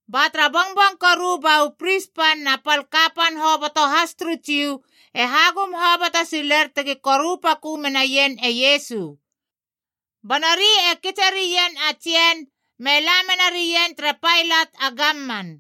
Ba tara bongbong koru ba u pris pan na pal kapan hoboto has turu Jiu e hagum hoboto siler tegi koru pakö menaien e Iesu. Ba nori e kitse rien a tsien me la menarien tere Pailat a gamman.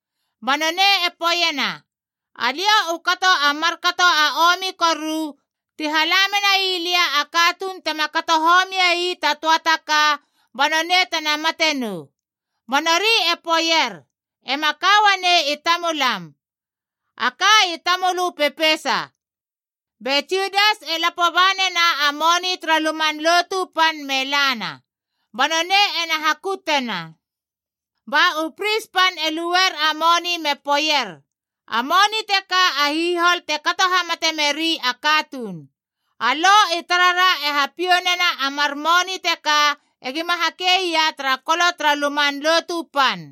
Ba nonei e poeiena, “Alia u kato a markato a omi koru ti hala menai lia a katuun tema kato homiei ta töa taka, ba nonei tena mate nou!” Ba nori e poeier, “Ema ka uanei i tamulam. A ka i tamölö pepeisa.” Be Judas e lapo ba nena a moni tara Luman Lotu Pan me lana, ba nonei ena hakutena. Ba u pris pan e luer a moni me poeier, “A moni teka a hihol te kato hamate meri a katuun. A Lo i tarara e hapiou nena a mar moni teka egima hakeia tara kolo tara Luman Lotu Pan.”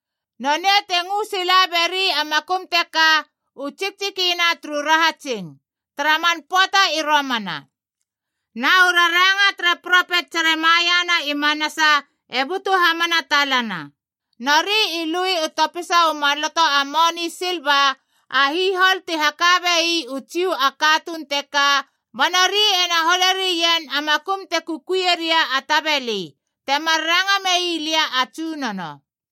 Nonei te ngö sila beri a makum teka, “U Tsiktsikina turu Rahatsing” tara man pöata i romana. Na u raranga tere propet Jeremaia na i manasa e butu hamana talana, “Nori i lui u topisa u maloto a moni silva, a hihol ti haka bei u Jiu a katuun teka, ba nori ena hole rien a makum te kukuie ria a tabeli, temar ranga mei lia a Tsunono.”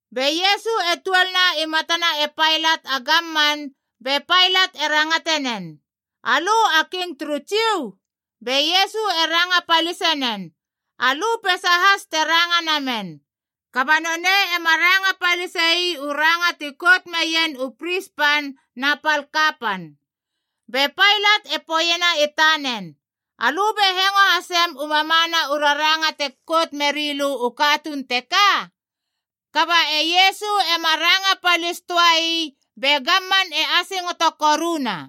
Be Iesu e tuolna i matana e Pailat a gamman be Pailat e rangate nen, “Alö a King turu Jiu?” Be Iesu e ranga palisinen, “Alö peisa has te ranga namen.” Kaba nonei ema ranga palisei u ranga ti kout meien u pris pan na pal kapan. Be Pailat e poeiena i tanen, “Alö be hengo hasem u mamana u raranga te kout meri lö u katuun teka?” Kaba e Iesu ema ranga palis töa ii, be gamman e asingoto koruna.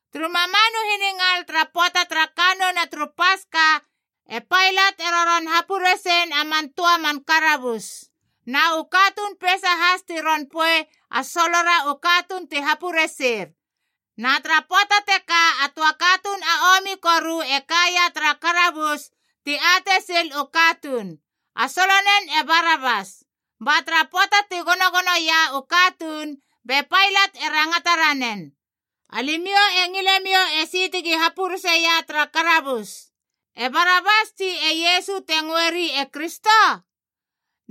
Turu mamanu hiningal tara pöata tara kannouna turu Paska, e Pailat e roron hapuresen a man töa man karabus, na u katuun peisa has ti ron poei a solora u katuun ti hapureser. Na tara pöata teka a töa katuun a omi koru e kaia tara karabus ti atei sil u katuun, a solonen e Barabas. Ba tara pöata ti gonogonoia u katuun, be Pailat e rangata ranen, “Alimiou e ngilemiou esi tegi hapureseia tara karabus, e Barabas tsi e Iesu te ngöeri e Kristo?”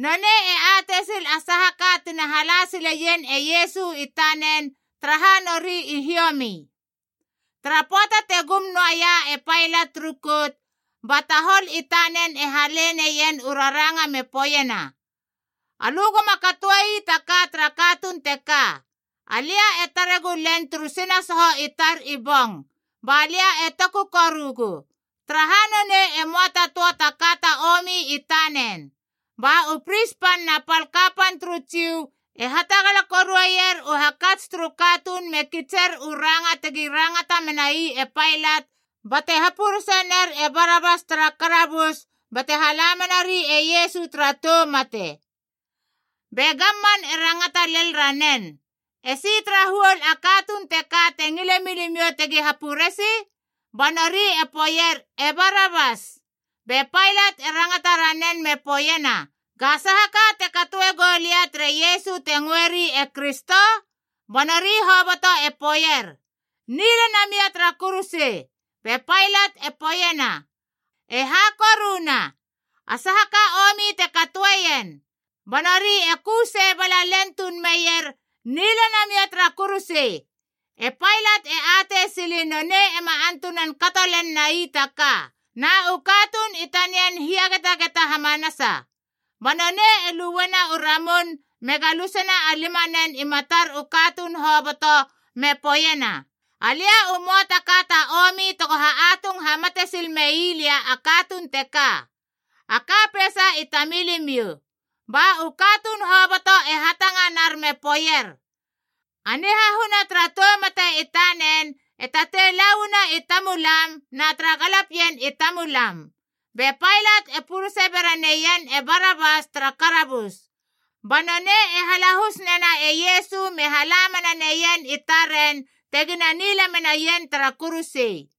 Nonei e atei sil a saha ka tina hala sileien e Iesu i tanen, taraha nori i hiomi. Tara pöata te gum noaia e Pailat turu kout, ba tahol i tanen e hale neien u raranga me poeiena, “Alö goma katoei ta ka tara katuun teka. Alia e tare gulen turu sinasoho i tar i bong, balia e toku korugu. Taraha nonei e möa ta töa taka ta omi i tanen.” Ba u pris pan na pal kapan turu Jiu e hatagala korueier u hakats turu katuun me kitser u ranga tegi rangata menai e Pailat bate hapuresener e Barabas tara karabus bate hala menari e Iesu tara tou mate. Be gamman e rangata lel ranen, “Esi tara huol a katuun teka te ngile milimiou tegi hapuresi?” Ba nori i poeier, “E Barabas!” Be Pailat e rangata ranen me poeiena, “Ga saha ka te katoe gou lia tere Iesu te ngöeri e Kristo?” Ba nori hoboto e poeier, “Nila namia tara kuruse!” Be Pailat e poeiena, “E ha koruna? A saha ka omi te katoeien?” Ba nori e ku sei bala tuun len meier, “Nila namia tara kuruse!” E Pailat e atei sili nonei ema antunan kato len nai taka, na u katuun i tanian hiagetageta hamanasa. Ba nonei e luena u ramun me galusena a limanen i matar u katuun hoboto, me poeiena, “Alia u möa ta ka ta omi tego ha atung hamate sil mei lia a katuun teka! A ka peisa i tamilimiou.” Ba u katuun hoboto e hatanganar me poeier, “A nihahuna tara tou mate i tanen e tatei la uana i tamulam na tara galapien i tamulam!” Be Pailat e purese bera neien e Barabas tara karabus. Ba nonei e halahus nena e Iesu me hala mena neien i taren tegina nila menaien tara kuruse.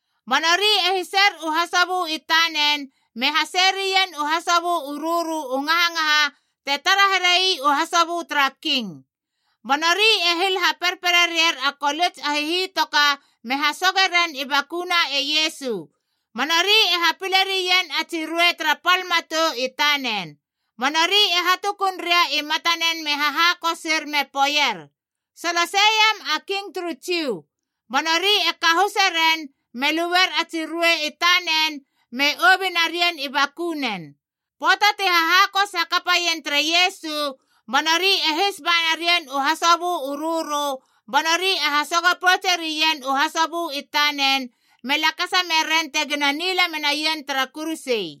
Ba nori e hiser u hasobö i tanen me haseie rien u hasobö u rörö u ngahangaha te tara herei u hasobö tara king. Ba nori e hil haperperere ier a kolits a hihitoka me hasoge ren i bakuna e Iesu, ba nori e hapile rien a tsi ruei tara pal matou i tanen. Ba nori e hatukun ria i matanen me hahakosir me poeier, “Solosei iam a King turu Jiu!” Ba nori e kahuse ren, me luer a tsi ruei i tanen me obi narien i bakunen. Pöata ti hahakos hakapaien tere Iesu, ba nori e his ba narien u hasobö u rörö ba nori e hasogo poutse rien u hasobö i tanen, me lakasa meren tegina nila menaien tara kuruse.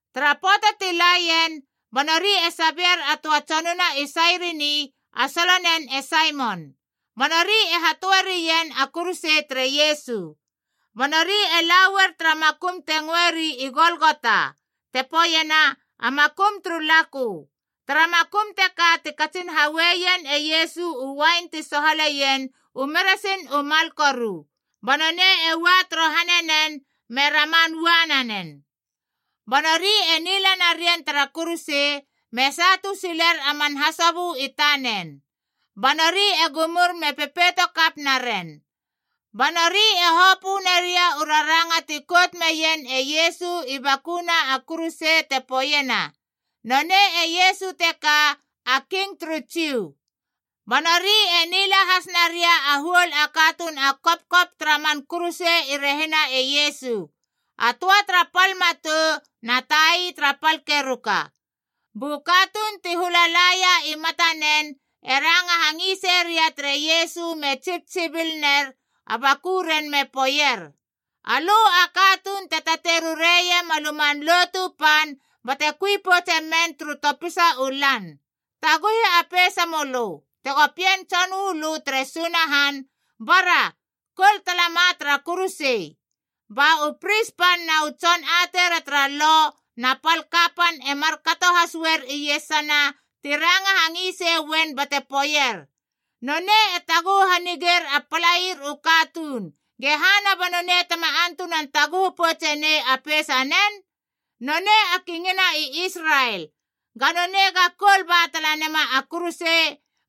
Tara pöata ti laien, ba nori e sabeier a töa tsonuna i Sairini, a solonen e Saimon. Ba nori e hatöe rien a kuruse tere Iesu. Ba nori e la uer tara makum te ngöeri i Golgota, te poeiena “A Makum turu Lakö.” Tara makum teka ti katsin haueien e Iesu u uain ti sohaleien u meresin u mal koru. Ba nonei e ua torohane nen, me raman ua nanen. Ba nori e nila narien tara kuruse, me satu siler a man hasobö i tanen. Ba nori e gumur me pepeito kap naren. Ba nori e hopö naria u raranga ti kout meien e Iesu i bakuna a kuruse te poeiena: Nonei e Iesu teka, a King turu Jiu. Ba nori e nila has naria a huol a katuun a kopkop tara man kuruse i rehina e Iesu, a töa tara pal matou na tai tara pal keruka. Bu katuun ti hula laia i matanen e ranga hangisei ria tere Iesu me tsibtsibil ner a bakuren me poeier, “Alö a katuun te tatei rureiem a Luman Lotu Pan bate kui poutse men turu topisa u lan, taguhi a peisa mölö! Tego Pien Tson uu lö tere Sunahan, bara, koul talama tara kuruse!” Ba u pris pan na u tson ateira tara Lo na pal kapan e markato has uar iesana ti ranga hangisei uen bate poeier, “Nonei e taguhu hanigeir a palair u katuun, gehana ba nonei tema antunan taguhu poutsenei a peisanen? Nonei a Kingina i Israel, Ga nonei ega koul ba tala nema a kuruse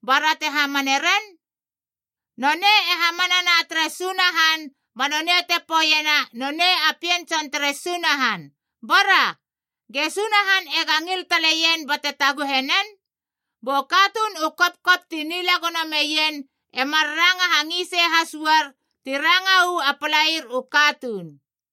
bara te hamane ren! Nonei e hamanana tere Sunahan ba nonei te poeiena nonei a Pien tson tere Sunahan. Bora, ge Sunahan ega ngil taleien bate taguhe nen!” Bu katuun u kopkop ti nila gono meien e mar ranga hangisei has uar ti ranga uu a palaier u katuun.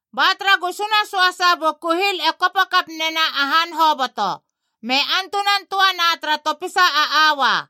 Ba tara gusuna söasa bu kuhil e kopo kap nena a han hoboto, me antunan töana tara topisa a aua.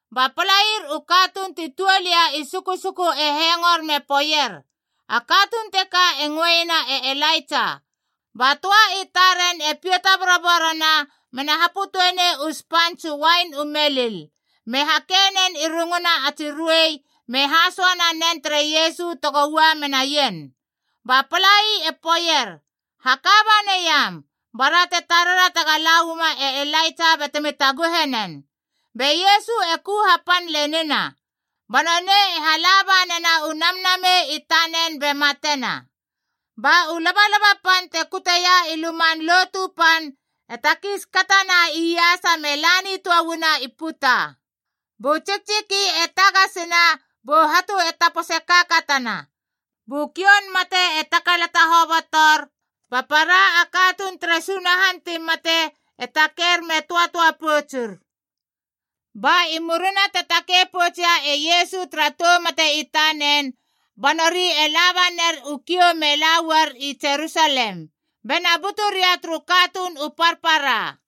Ba palair u katuun ti tuol ia i susuku e hengor me poeier, “A katuun teka e ngöeiena e Elaitsa!” Ba töa i taren e pita boroborona, mena hapötöe nei u spants u uain u melil, me hakei nen i runguna a tsi ruei, me hasoa nanen tere Iesu tego ua menaien. Ba palai e poeier, “Haka banaiam, bara te tarera tega la uama e Elaitsa batemi taguhe nen!” Be Iesu e ku hapan lenina, ba nonei e hala banena u namnamei i tanen be matena. Ba u labalaba pan te kuteia i Luman Lotu Pan e takiis katana iasa me la nitöana i puta. Bu tsiktsiki e tagasina, bu hatu e tapose kaakatana. Bu kioun mate e takalata hobotor, ba para a katuun tere Sunahan ti mate e taker me töatöa poutsur. Ba i murina te takei poutsia e Iesu tara tou mate i tanen, ba nori e labaner u kiou me la uar i Jerusalem, bena butu ria turu katuun u parpara.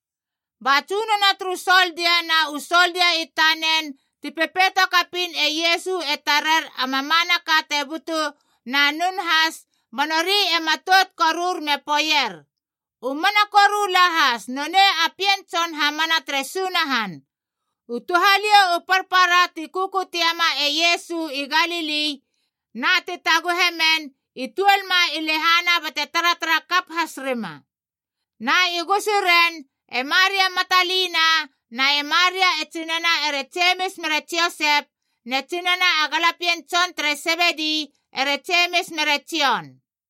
Ba tsunono turu soldia na u soldia i tanen ti pepeito kapiin e Iesu e tarer a mamanaka te butu, na nun has, ba nori e matout korur me poeier, “U mana koru lahas nonei a Pien Tson hamana tere Sunahan!” U touhaliou u parpara ti kukutie ma e Iesu i Galili na ti taguhe men i tuol ma i lehana bate taratara kap has rima. Na i gusuren e Maria Matalina na e Maria e tsinana ere Jemis mere Josep, ne tsinana a galapien tson tere Sebedi ere Jemis mere Jon.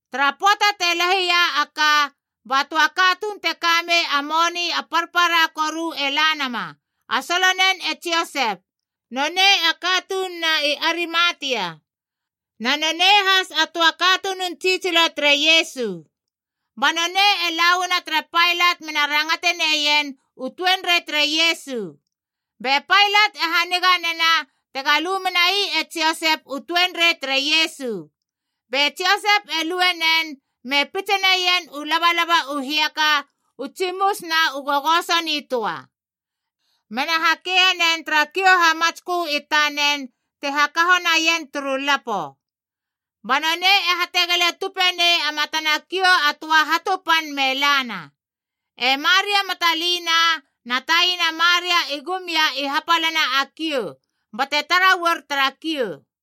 Tara pöata te lahi ia a ka, ba töa katuun te kamei a moni a parpara koru e la nama, a solonen e Josep. Nonei a katununa i Arimatia, na nonei has a töa katunun tsitsilo tere Iesu. Ba nonei e la uana tere Pailat mena rangate neien u tuenrei tere Iesu. Be Pailat e haniga nena tega lu menai e Josep u tuenrei tere Iesu. Be Josep e lue nen, me pitse neien u labalaba u hiaka u tsimus na u gogoso nitöa. Mena hakeie nen tara kiou hamatskö i tanen te hakaho naien turu lapo. Ba nonei e hategele tupe nei a matana kiou a töa hatu pan me lana. E Maria Matalina na taina Maria i gum ia i hapalana a kiou, bate tara uar tara kiou.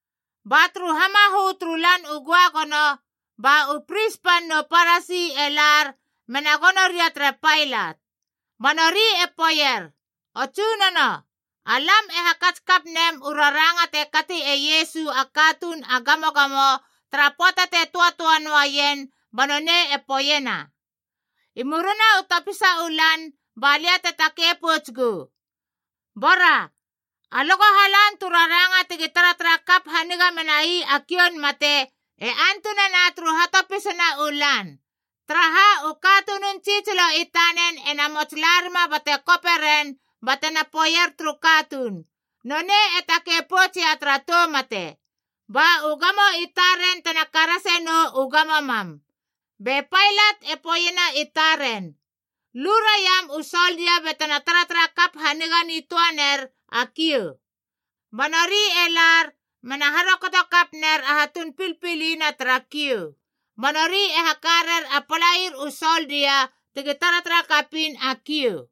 Ba turu hamahö, turu Lan u Göagono, ba u pris pan nu Parasi e lar mena gono ria tere Pailat. Ba nori e poeier, “O Tsunono, alam e hakats kap nem u raranga te kati e Iesu a katuun a gamogamo tara pöata te töatöa noa ien ba nonei e poeiena, ‘I murina u topisa u lan ba lia te takei pouts gou.’ Bora alö go halan tu raranga tegi taratara kap haniga menai a kioun mate e antunana turu hatopisana u lan, taraha u katunun tsitsilo i tanen ena mots larima bate kope ren batena poeier turu katuun, ‘Nonei e takei poutsia tara tou mate.’ Ba u gamo i taren tena karase nou u gamo mam.” Be Pailat e poeiena i taren, “Lu raiam u soldia batena taratara kap haniga nitöa ner a kiou.” Ba nori e lar, mena harokoto kap ner a hatun pilpili na tara kiou, ba nori e haka rer a palair u soldia tegi taratara kapiin a kiou.